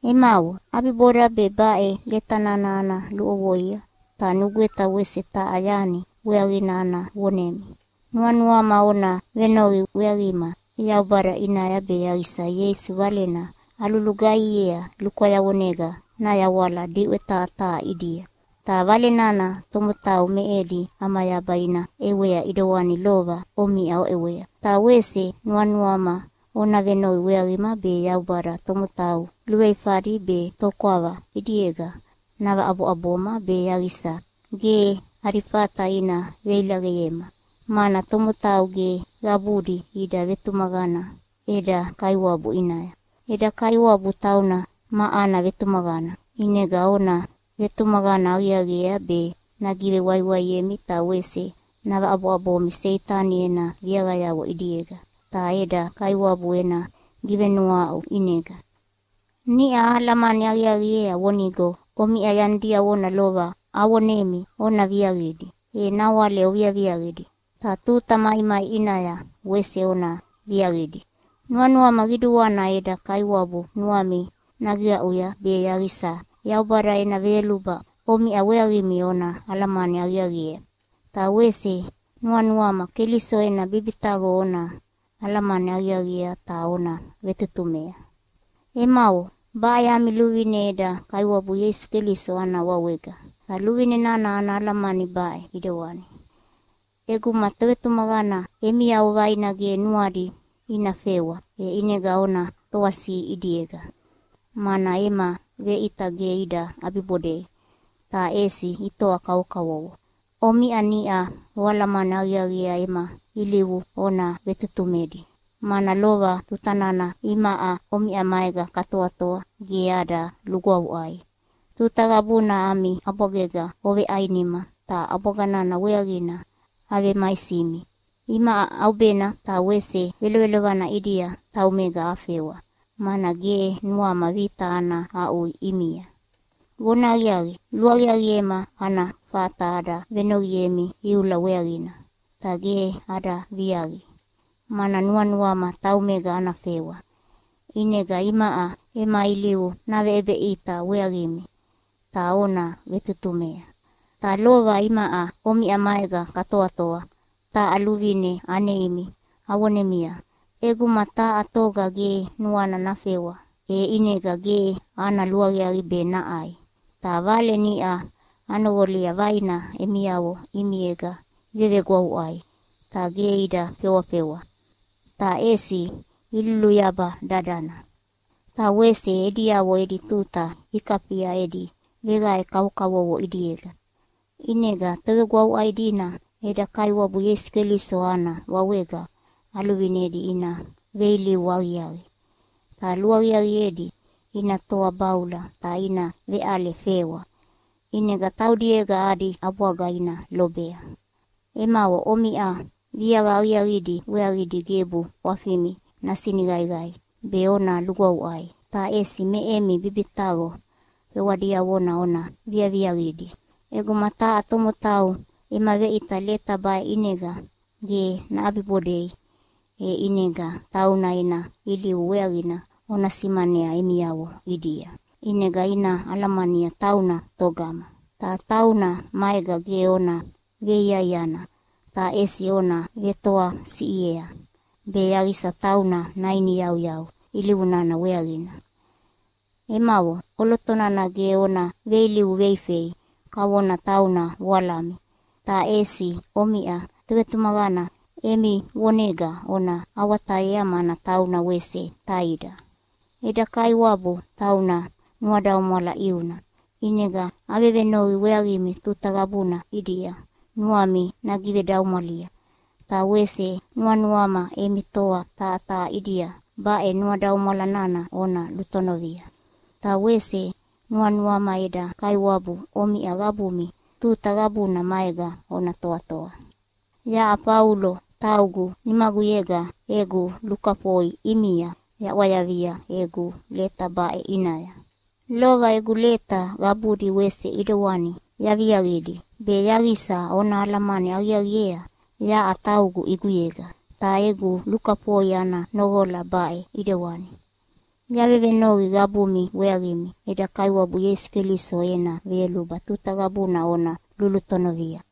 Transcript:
Emavo, ʼabiboda be baʼe leta nana ana luʼovoia, ta nugweta wese taha yani weaqina ana vonemi. Nuanuama ona venoqi weaqima Yaubada ʼinaya be yaqisa Ieisu Valena alulugaihiea lukwayavonega nayawala diʼwe taha taha ʼidia, ta Vale nana tomotau me edi ʼamayaba ina ʼewea ʼidewani lova omiʼa oʼewea. Ta wese nuanuama ona venoqi weaqima be Yaubada tomotau luveifadi be tokwava ʼidiega navaʼaboʼaboma be yaqisa ge adi fata ina veilaqeyema, mana tomotau ge qabudi ida vetumaqana eda Kaiwabu ʼinaya. Eda Kaiwabu tauna ma ana vetumaqana, ʼinega ona vetumaqana aqiaqiea be nagivewaiwaiemi ta wese navaʼaboʼabomi Seitani ena viaqayavo ʼidiega. Ta eda Kaiwabu ena givenuahaʼu ʼinega niʼa ahalamani aqiaqiea vonigo omiʼa yani diavona lova avonemi ona viaqidi, e nawale oviaviaqidi, ta tuta maimai ʼinaya wese ona viaqidi. Nuanuama qiduana eda Kaiwabu nuami nagiqaʼuya be yaqisa Yaubada ena veyoluba omiʼa weaqimi ona alamani aqiaqiea. Ta wese nuanuama Keliso ena bibitaqo ona alamani aqiaqiea ta ona vetutumea. Emavo, baʼe ami luvine eda Kaiwabu Ieisu Keliso ana wawega. Ta luvine nana ana alamani baʼe ʼidewani: ʼEguma tovetumaqana emiavo vaina ge nuadi ina fewa, e ʼinega ona toasiʼi ʼidiega, mana ema veʼita ge ida ʼabibodei, ta ʼesi itoa kavokavovo. Omiʼa niʼa oalamani aqiaqiea ema ilivu ona vetutumedi, mana lova tuta nana imaʼa omiʼa maega katoatoa ge ada lugwavuʼai. Tuta qabuna ami ʼabwagega oveʼainima ta ʼabwaga nana weaqina avemaisimi. Imaʼa ʼaubena ta wese velovelovana ʼidia taumega afewa, mana ge nuama vita ana aʼui ʼimia. Vonahaqiaqi, luaqiaqiema ana fata ada venoqiemi iula weaqina. Ta ge ada viaqi, mana nuanuama taumega ana fewa, ʼinega imaʼa ema ilivu naveʼebeʼita weaqimi ta ona vetutumea. Ta lova imaʼa omiʼa maega katoatoa taha luvine aneimi avonemia, “ʼEguma taha toga ge nuana fewa, e ʼinega ge ana luaqiaqi be naʼai.” Ta vale niʼa anoqolia vaina emiavo ʼimiega ivevegwavuʼai ta ge ida fewafewa, ta ʼesi iluluyaba dadana, ta wese ediavo edi tuta ikafia edi veqae kavokavovo ʼidiega. ʼInega tovegwavuʼai dina eda Kaiwabu Ieisu Keliso ana wawega aluvinedi ina veilivu aqiaqi, ta luaqiaqiedi ina toa baula ta ina veʼale fewa, ʼinega taudiega adi ʼabwaga ina lobea. Emavo, omiʼa viaqa aqiaqidi weaqidi gebu ʼwafimi nasiniqaiqai be ona lugwavuʼai, ta ʼesi me emi bibitaqo fewa diavona ona viaviaqidi. ʼEguma taha tomotau ema veʼita leta baʼe ʼinega ge naʼabibodei, e ʼinega tauna ena ilivu weaqina ona simanea emiavo ʼidia, ʼinega ina alamania tauna togama. Ta tauna maega ge ona veiaiana, ta ʼesi ona vetoasiʼiea be yaqisa tauna nainiyauyau ilivu nana weaqina. Emavo, ʼoloto nana ge ona veilivu veifei kavona tauna voalami, ta ʼesi omiʼa tovetumaqana emi vonega ona awatayea mana tauna wese taida. Eda Kaiwabu tauna nuadaumwala ʼiuna, ʼinega avevenoqi weaqimi tuta qabuna ʼidia nuami nagivedaumwalia, ta wese nuanuama emi toa taha taha ʼidia baʼe nuadaumwala nana ona lutonovia. Ta wese nuanuama eda Kaiwabu omiʼa qabumi tuta qabuna maega ona toatoa. Yaʼa Faulo taugu nimaguyega egu lukafoi ʼimia yaʼwayavia egu leta baʼe ʼinaya. Lova egu leta qabudi wese ʼedewani yaviaqidi be yaqisa ona alamani aqiaqiea yaʼa taugu ʼiguyega. Ta egu lukafoi ana noqola baʼe ʼidewani: Yavevenoqi qabumi weaqimi eda Kaiwabu Ieisu Keliso ena veyoluba tuta qabuna ona lulutonovia.